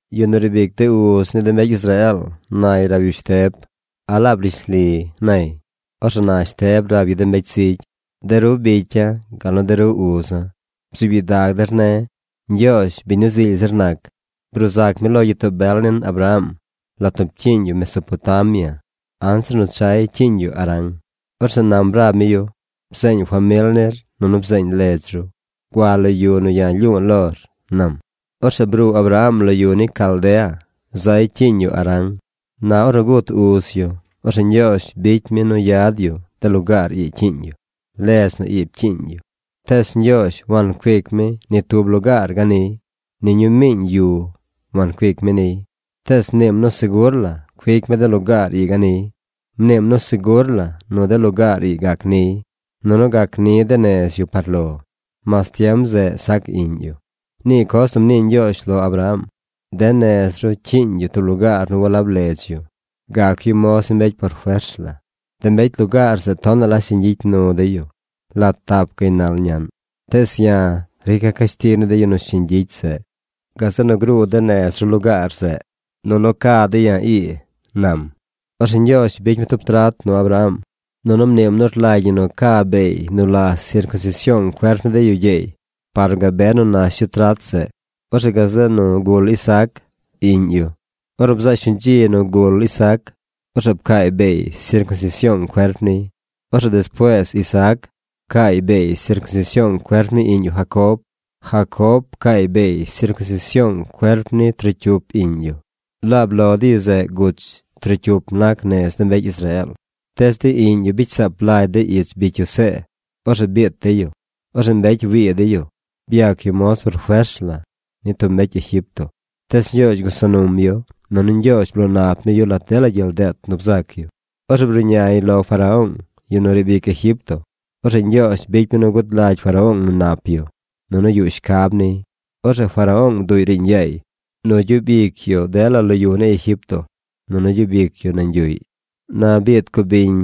Yu nu riib ic de uz ni de mbecy Israeel nay rab yu Shteb: ―¿A laab rishli? ―nay. Orzeꞌ na Shteb rab yu de mbecy zigy: ―De ru bicya̱ gal nu de ru uza̱ bzuub gyidag der ne̱. Ñgyoozh, biñ nu zily zir nac, bruu zac mi lo gyitoo bel nin Abraham, lat nu pcyiiñ yu Mesopotamia, anzir nu chay cyiiñ yu Harán. Orzeꞌ nam rab mi yu: “Bzeeñ famil nir, nunu bzeeñ ledz ru. Gua lo yu nu ya̱ lyu̱u̱ lor”, nam. Orzeꞌ bruu Abraham lo de yu ni Caldea. Zay cyiiñ yu Harán. Na ornu gut uz yu, orzeꞌ Ñgyoozh bicy mi nu yad yu de lugaar ii cyiiñ yu. Ledz na ii pcyiiñ yu. Tees Ñgyoozh wancuic mi ni tub lugaar ganiy. Ni ñuu miiñ yu wancuic mi niy. Tees mniim nu segur la cuic mi de lugaar ii ganiy. Mniim nu segur la nu de lugaar ii gac niy, nunu gac ni de nez yu par lo, mas tiem zeꞌ sac iꞌñ yu. Nii coz nu mnii Ñgyoozh lo Abraham: “De nez ru rcyiiñ yu tub lugaar nu walab ledz yu. Gac yu moz ni mbecy por fers la. De mbecy lugaar zeꞌ tonaꞌ la shiñ gyicy nu dey yu lat tap gaynal naꞌñ. Tees ya̱ rica̱ cashtig ni de yu nu shiñ gyicy zeꞌ. Gazeꞌ nu gruu de nez ru lugaar zeꞌ, nunu ca dey ya̱ ii”, nam. Orzeꞌ Ñgyoozh bicy mi tub trat nu Abraham, nunu mniim nu rlagy ñi ca beey nu la sircunsision cuerp ni de yu gyeey par nu gabe nu nac nuy trat zeꞌ. Orzeꞌ gazeꞌ nu gul Isaac, iꞌñ yu. Ornu bzaꞌ shuñ dzi nu gul Isaac, orzeꞌ pcaay beey sircunsision cuerp niy. Orzeꞌ despuees Isaac pcaay beey sircunsision cuerp ni iꞌñ yu Jacob. Jacob pcaay beey sircunsision cuerp ni trocyup iꞌñ yu: laab lo de yu zeꞌ guch trocyup nac nez de mbecy Israeel. ’Tees de iꞌñ yu bicy saap lagy dey ich bicy yu See. Orzeꞌ biit dey yu. Orzeꞌ mbecy wii dey yu. Byac yu moz por fers la ni tub mbecy Egipto. Tees Ñgyoozh gusa num yu. Nunu Ñgyoozh bloo nap mi yu lat dela gyel deet nu bzac yu. Ornu bruꞌñay lo Faraón, yu nu riib ic Egipto, orzeꞌ Ñgyoozh bicy mi nu gud lagy Faraón nu nap yu, nunu yuꞌ shcab niy. Orzeꞌ Faraón bduꞌy riiñ yaay nu gyub ic yu lo dela yu ni Egipto, nunu gyub ic yu nañ yuꞌy. ’Na biid cubiñ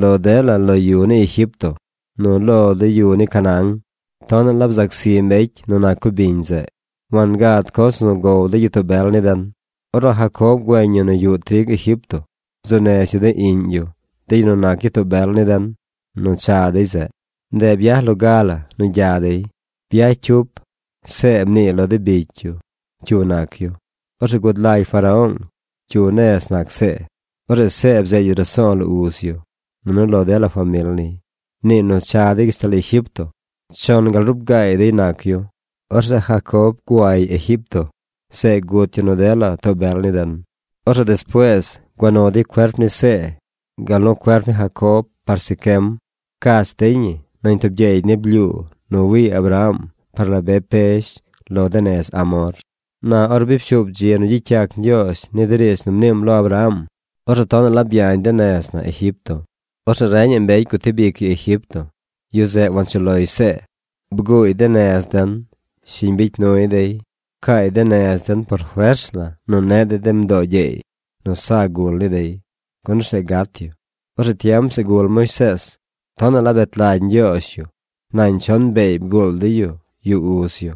lo dela de yu ni Egipto nu lo de yu ni Canaán. Tonaꞌ la bzac zi mbecy nu nac cubiñ zeꞌ. Wangad coz nu gow de gyitoo bel ni den. Ornu Jacob güeñ yu nu yuꞌ trig Egipto, bzuu nez yu de iꞌñ yu, de yu nu nac gyitoo bel ni den, nu cha dey zeꞌ. Ndeꞌ byaj loga la nu gya dey. Byaj cyup See mniiy lo de bicy yu cyu nac yu. Orzeꞌ gud lagy Faraón cyu nez nac See. Orzeꞌ See bzeed yu raso̱o̱ lo uz yu, nunu lo dela famil niy. Mniiy nu cha dey gashtal Egipto. Chon gal ruub gaay dey nac yu. Orzeꞌ Jacob guay Egipto. Zeꞌ gut yu nu dela too bel ni den. Orzeꞌ despuees gua nu dey cuerp ni See, gal nu cuerp ni Jacob par Siquem. Pcach dey ñi nañ tub gyeeg ni blyuu nu wii Abraham par la be pezh lo de nez Hamor. ’Na or bi pshuub dzi nu gyicy yac Ñgyoozh ni de riidz nu mniim lo Abraham, orzeꞌ tonaꞌ la byañ de nez na Egipto. Orzeꞌ reñaꞌ mbecy gutib ic yu Egipto. Yu zeꞌ wanchuꞌ loy See. Bguuy de nez den. Shiñ bicy nuy dey. Pcaay de nez den por fers la nu neꞌ dey de mdoo gyeey nu sa gul ni dey, gun orzeꞌ gat yu. Orzeꞌ tiem zeꞌ gul Moisees. Tonaꞌ la bet lagy Ñgyoozh yu. Nañ chon beey bguul dey yu yuꞌ uz yu.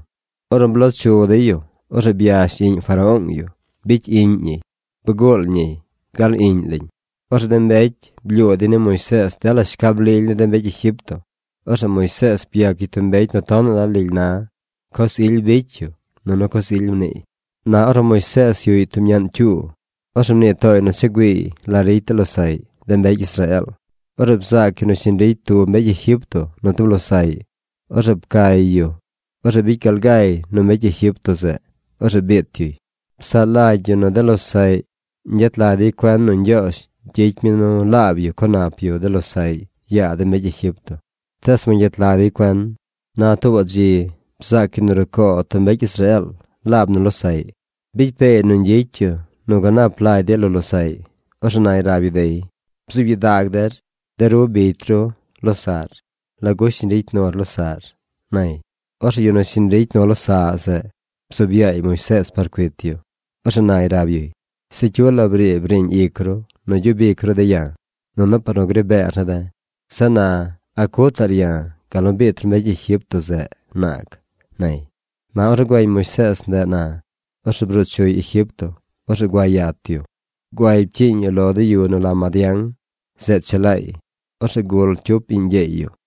Ornu bloo chu dey yu, orzeꞌ byash iꞌñ Faraón yu. Bicy iꞌñ ñiy. Bguul ñiy gal iꞌñ lañ. Orzeꞌ de mbecy blyuu dey ni Moisees dela shcab lily ni de mbecy Egipto. Orzeꞌ Moisees byac yu tub mbecy nu tonaꞌ la lily na. Coz ily bicy yu, nunu coz ily mniiy. ’Na ornu Moisees yuꞌy tub ñaꞌn cyuu, orzeꞌ mnii tooy nu cha güiiy la ricy de losaꞌy, de mbecy Israeel. Orzeꞌ bzaac yu nu shiñ ricy tub mbecy Egipto nu tub losaꞌy. Orzeꞌ pcay yu. Orzeꞌ bicy gal gay nu mbecy Egipto zeꞌ. Orzeꞌ biit yuy. Psaꞌ lagy yu nu de losaꞌy ñgyet lag dey cuen nu Ñgyoozh gyicy mi nu laab yu co nap yu de losaꞌy yaa de mbecy Egipto. Tees wangyet lag dey cuen. Na tuubaꞌ dzi bzaac yu nu rucoo tub mbecy Israeel laab nu losaꞌy. Bicy peey nu ñgyicy yu nu ganap lagy dey lo losaꞌy. Orzeꞌ nay rab yu dey: “¡Bzub gyidag der! De ru bicy ru losaꞌr. ¿Lagu shiñ ricy nur losaꞌr?” nay. Orzeꞌ yu nu shiñ ricy nu losaꞌ zeꞌ bzuub yaay Moisees par cuit yu. Orzeꞌ nay rab yuy: “Se cyu la briib riiñ ic ru nu gyub ic ru de̱ ya̱, nunu par nu gri beer ne̱ de̱. Zeꞌ na, ¿a cutaꞌr ya̱ gal nu biit ru mbecy Egipto zeꞌ naag?” nay. ’Na ornu güeñ Moisees ndeꞌ na, orzeꞌ bruu chuy Egipto. Orzeꞌ gua yat yu. Guay pcyiiñ yu lo de yu nu la Madián. Zeꞌ pchelaay. Orzeꞌ gul cyup iꞌñ gyeey yu.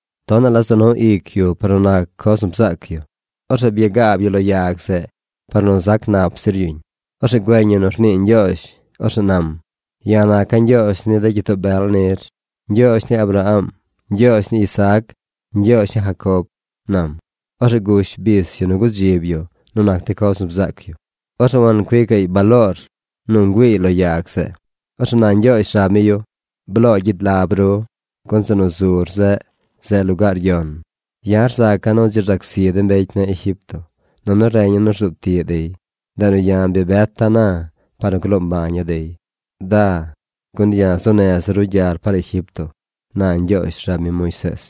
Tonaꞌ la za nu ic yu par nu nac coz nu bzaac yu. Orzeꞌ byagaab yu lo yag zeꞌ par nu zac nap zir yuñ. Orzeꞌ güeñ yu nu rnii Ñgyoozh. Orzeꞌ nam: “Ya̱ naca̱ Ñgyoozh ni de gyitoo bel nir: Ñgyoozh ni Abraham, Ñgyoozh ni Isaac, Ñgyoozh ni Jacob”, nam. Orzeꞌ gush bis yu nu gudzib yu nu nac de coz nu bzaac yu. Orzeꞌ wancuicaꞌy baloor nu ngüiiy lo yag zeꞌ. Orzeꞌ na Ñgyoozh rab mi yu: “Bloo gyid lab ru, gun zeꞌ nu zur zeꞌ, zeꞌ lugaar yon. Ya̱ rzaca̱ nu dzi rzac zi de mbecy ne̱ Egipto, nunu reña̱ nu rzuub tiꞌ dey. Ndeꞌ nu ya̱ bi beta̱ na, par nu gloo mbaña̱ dey. Da, gun ya̱ zuu neza̱ ru gyar par Egipto”, na Ñgyoozh rab mi Moisees.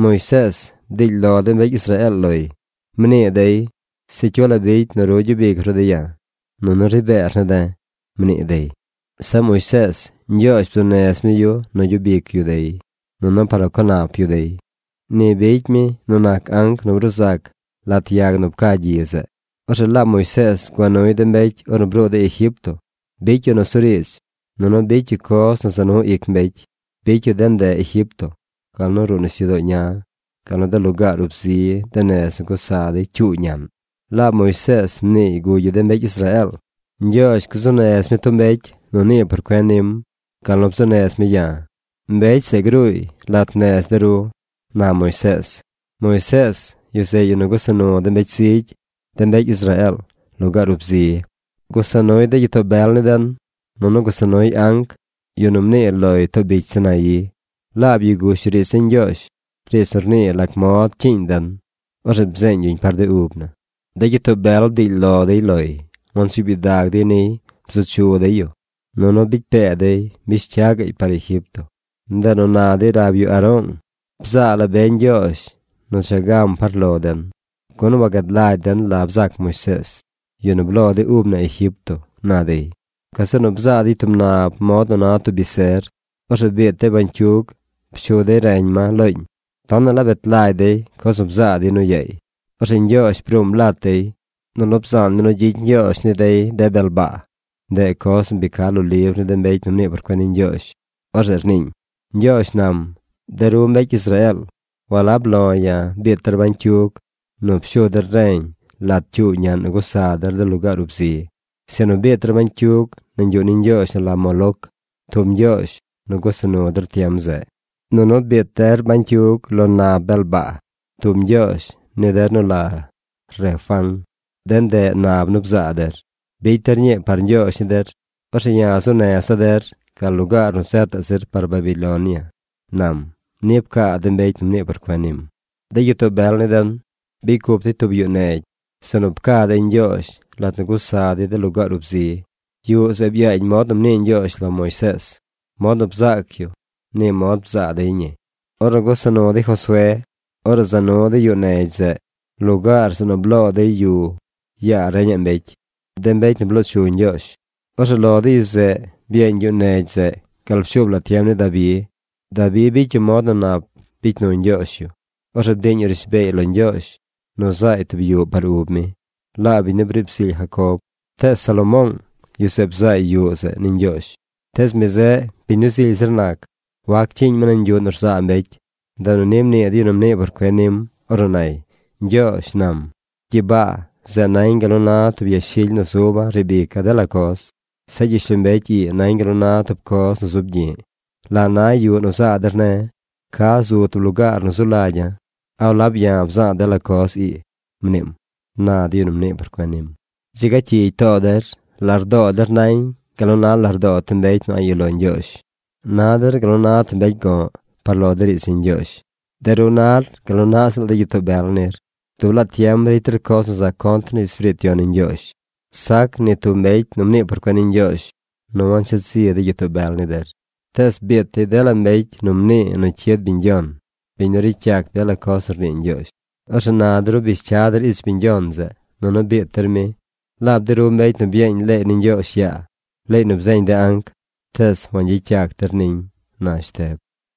’Moisees, bdiily lo de mbecy Israeel loy. Mnii dey: “Se cyu la bicy nu ru gyub ic ru de̱ ya̱, nunu ri beer ne̱ de̱”, mnii dey. Zeꞌ Moisees Ñgyoozh bzuu nez mi yu nu gyub ic yu dey, nunu par nu co nap yu dey. Ni bicy mi nu nac anc nu bruu zac lat yag nu pca gyi zeꞌ. Orzeꞌ laab Moisees gua nuy de mbecy ornu bruu dey Egipto. Bicy yu nusuriidz, nunu bicy yu coz nu za nu ic mbecy. Bicy yu de ndeꞌ Egipto, gal nu ruꞌ nisyudoo ña, gal nu de lugaar ub zi de nez nu gusa dey cyuu ñaꞌn. Laab Moisees mniiy gugy yu de mbecy Israeel: “Ñgyoozh gzuu nez mi tub mbecy nu nii por cuen nim gal nu bzuu nez mi ya̱. Mbecy zeꞌ gruuy lat nez de ru”, na Moisees. Moisees, yu zeꞌ yu nu gusa lat de mbecy zigy, de mbecy Israeel, lugaar ub zi. Gusa nuy de gyitoo bel ni den, nunu gusa nuy anc, yu nu mnii loy too bicy Sinaí. Laab yu gush yu riidz ni Ñgyoozh, riidz nu rnii lac mod cyiiñ den. Orzeꞌ bzeeñ yuñ par de ub na. ’De gyitoo bel bdiily lo dey loy. Wansuub gyidag dey niy. Bzu chu dey yu, nunu bicy pee dey mbish cya gaꞌy par Egipto. Ndeꞌ nu na dey rab yu Aroong: “Bzaa la be ñgyoozh nu cha gam par lo den, gun wagad lagy den la bzac Moisees, yu nu bloo de ub na Egipto”, na dey. Gazeꞌ nu bzaa dey tub nab mod nu na tub biser. Orzeꞌ biit dey bañcyug. Pshu dey reñ ma looñ. Tonaꞌ la bet lagy dey coz nu bzaa dey nu yaay. Orzeꞌ Ñgyoozh bruum lat dey. Nunu bzaan mi nu gyicy ñgyoozh dey de bel baa. Ndeꞌ coz nu bi ca lo libr ni de mbecy nu mnii por cuen ni Ñgyoozh. Orzeꞌ rniiñ: Ñgyoozh nam: De ru mbecy Israeel, walab lo ya̱ biit der bañcyug nu pshur reñ lat cyuu ñaꞌn nu gusa der de lugaar ub zi. Sinu biit der bañcyug nañ yuꞌ ni ñgyoozh nu la Moloc, tub ñgyoozh nu gusa nu der tiem zeꞌ. Nunu biit der bañcyug lo nab bel baa, tub ñgyoozh ni der nu la Refán. De ndeꞌ nab nu bzaa der. Bicy der ñii par ñgyoozh ni der. Orzeꞌ ya̱ zuu neza̱ der gal lugaar nu zetaꞌ zir par Babilonia, nam, ni pcaa de mbecy nu mnii por cuen nim. ’De gyitoo bel ni den bicy cup dey tub yuꞌ negy zeꞌ nu pca dey Ñgyoozh lat nu gusa dey de lugaar ub zi. Yuꞌ zeꞌ byaañ mod nu mnii Ñgyoozh lo Moisees. Mod nu bzaac yu, ni mod bzaa dey ñi. Ornu gusa nu dey Josué, orzeꞌ za nu dey yuꞌ negy zeꞌ lugaar zeꞌ nu bloo dey yu yaa reñaꞌ mbecy, de mbecy nu bloo chu Ñgyoozh. Orzeꞌ lo de yu zeꞌ byeeñ yuꞌ negy zeꞌ gal pshuub la tiem ni Dabi. Dabi bicy yu mod nu nap bicy nu Ñgyoozh yu. Orzeꞌ bdiiñ yu rishbeey lo Ñgyoozh nu zaay tub yuꞌ par ub mi, laab biñ nu briib zily Jacob. Tees Salomoong, yu zeꞌ bzaay yuꞌ zeꞌ ni Ñgyoozh. Tees mi zeꞌ, biñ nu zily zir nac wac cyiiñ mi nañ yuꞌ nu rzaa mbecy. Ndeꞌ nu ni mnii de yu nu mnii por cuen nim ornu nay: Ñgyoozh nam: “Gyibaa, zeꞌ nañ gal nu na tub yashily nu zuba̱ riib ica̱ dela coz. Zeꞌ gyishlombecy ii nañ gal nu na tub coz nu zub gyi̱ꞌ. ¿La na yuꞌ nu zaa der ne̱? ¿Ca zu tub lugaar nu zu lagya̱? ¿A walab ya̱ bza̱a̱ dela coz ii?” mniim, na de yu nu mnii por cuen nim. ’¡Dzi ga cyigy too der! ¡Lardoo der nañ gal nu na lardoo tub mbecy nu a̱ꞌ yuꞌ lo Ñgyoozh! Na der gal nu na tub mbecy go̱ꞌ par lo de riidz ni Ñgyoozh. De ru nar gal naꞌ ziꞌl de gyitoo bel nir. Dub laa tiem ricy der coz nu za contr ni Espiriit Yon ni Ñgyoozh. Sac ni tub mbecy nu mnii por cuen ni Ñgyoozh nu wansheed zi de gyitoo bel ni der. Tees biit dey dela mbecy nu mnii nu cyid biñ Yon, biñ nu ricy yac dela coz nu rnii Ñgyoozh. Orzeꞌ na de ru bish cya der ich biñ yon zeꞌ, nunu biit der mi. Laab de ru mbecy nu byeeñ leey ni Ñgyoozh yaa, leey nu bzeeñ de anc, tees wagyicy yac der niñ ―na Shteb.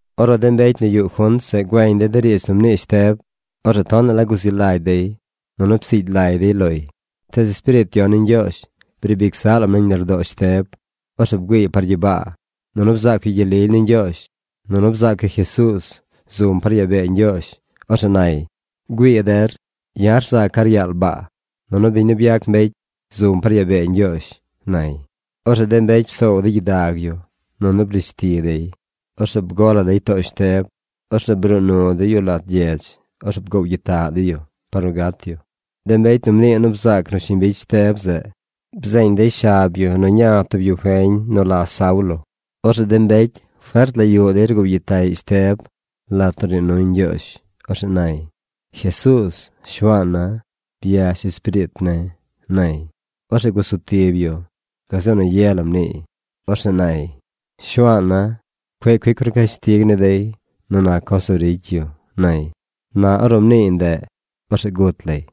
Ornu de mbecy nu yuꞌ junt zeꞌ güeñ dey de riidz nu mnii Shteb, orzeꞌ tonaꞌ la guzi lagy dey, nunu psiigy lay dey loy. Tees Espiriit Yon ni Ñgyoozh briib ic zaꞌ lam nañ lardoo Shteb. Orzeꞌ bgüiiy par gyibaa, nunu bzaac yu gyel lily ni Ñgyoozh, nunu bzaac yu Jesuuz zum par yaa bee Ñgyoozh. Orzeꞌ nay: ―¡Güii der! Ya̱ rzaca̱ ryaal baa, nunu biñ nu byac mbecy zum par yaa bee Ñgyoozh ―nay. Orzeꞌ de mbecy psoow dey gyidag yu, nunu brish ti dey. Orzeꞌ bgo la dey too Shteb. Orzeꞌ bruu nu dey yu lat gyedz. Orzeꞌ bgoow gyitaꞌ dey yu par nu gat yu. De mbecy nu mnii nu bzaac nu shiñ bicy Shteb zeꞌ bzeeñ dey shab yu nu ña tub yu feñ nu la Saulo. Orzeꞌ de mbecy fert la yuꞌ dey rgoow gyitaꞌy Shteb lat nu rnii nuy Ñgyoozh. Orzeꞌ nay: ―Jesuuz, Shuaana̱, byash espiriit ne̱ ―nay. Orzeꞌ gusu tib yu. Gazeꞌ nu ye la mniiy. Orzeꞌ nay: ―Shuaana̱, cueꞌ cuic ru cashtig ni dey nu nac coz nu ricy yu ―nay. Na ornu mniiy ndeꞌ, orzeꞌ gut lay.